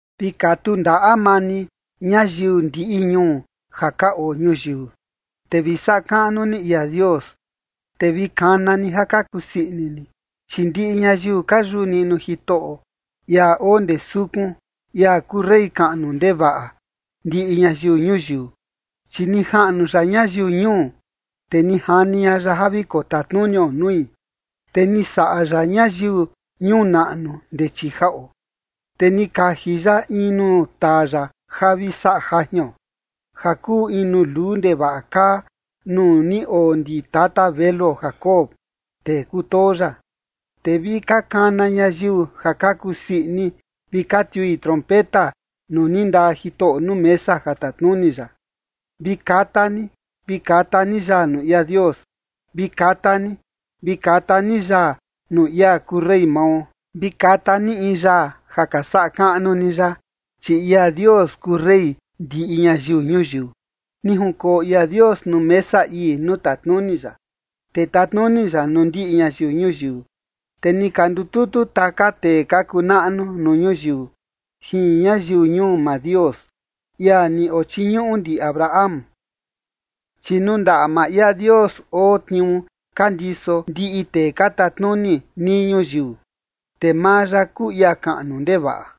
Vi katu ndaꞌa maa ni, ñayiu ndiꞌi ñuu ja ka oo ñuyiu, te vi saꞌa kaꞌnu ni ia Dios, te vi kana ni ja ka kusii ini ni. Chi ndiꞌi ñayiu ka yuꞌu niꞌnu Jitoꞌo, ia oo ndee sukun, ia kuu rey kaꞌnu ndevaꞌa ndiꞌi ñayiu ñuyiu. Chi ni jaꞌnu ya ñayiu ñuu, te ni jani ña ya ja vi kotatnunio nui, te ni saꞌa ya ñayiu ñuu naꞌnu ndee chii jaꞌo. Te ni kaji ya in nuu taa ya ja vi saꞌa jajion, ja kuu in nuu luu ndevaꞌa kaa nuu ni oo ndi tata veluo Jacob, tee kutoo ya. Te vi ka kana ñayiu ja ka kusii ini vi ka tiui trompeta nuu ni ndaa Jitoꞌo nuu mesa ja tatnuni ya. Vi kata ni, vi kata ni yaa nuu ia Dios, vi kata ni. Vi kata ni yaa nuu ia kuu rey mao. Vi kata ni in yaa ja ka saꞌa kaꞌnu ni ya, chi ia Dios kuu rey ndiꞌi ñayiu ñuyiu. Ni junkoo ia Dios nuu mesa ii nuu tatnuni ya. Te tatnuni ya nuu ndiꞌi ñayiu ñuyiu. Te ni ka ndututu taka tee ka kuu naꞌnu nuu ñuyiu jin ñayiu ñuu maa Dios, ia ni ochiñuꞌu ndi Abraham. Chi nuu ndaꞌa maa ia Dios oo tniuu ka ndiso ndiꞌi tee ka tatnuni nii ñuyiu, te maa ya kuu ia kaꞌnu ndevaꞌa.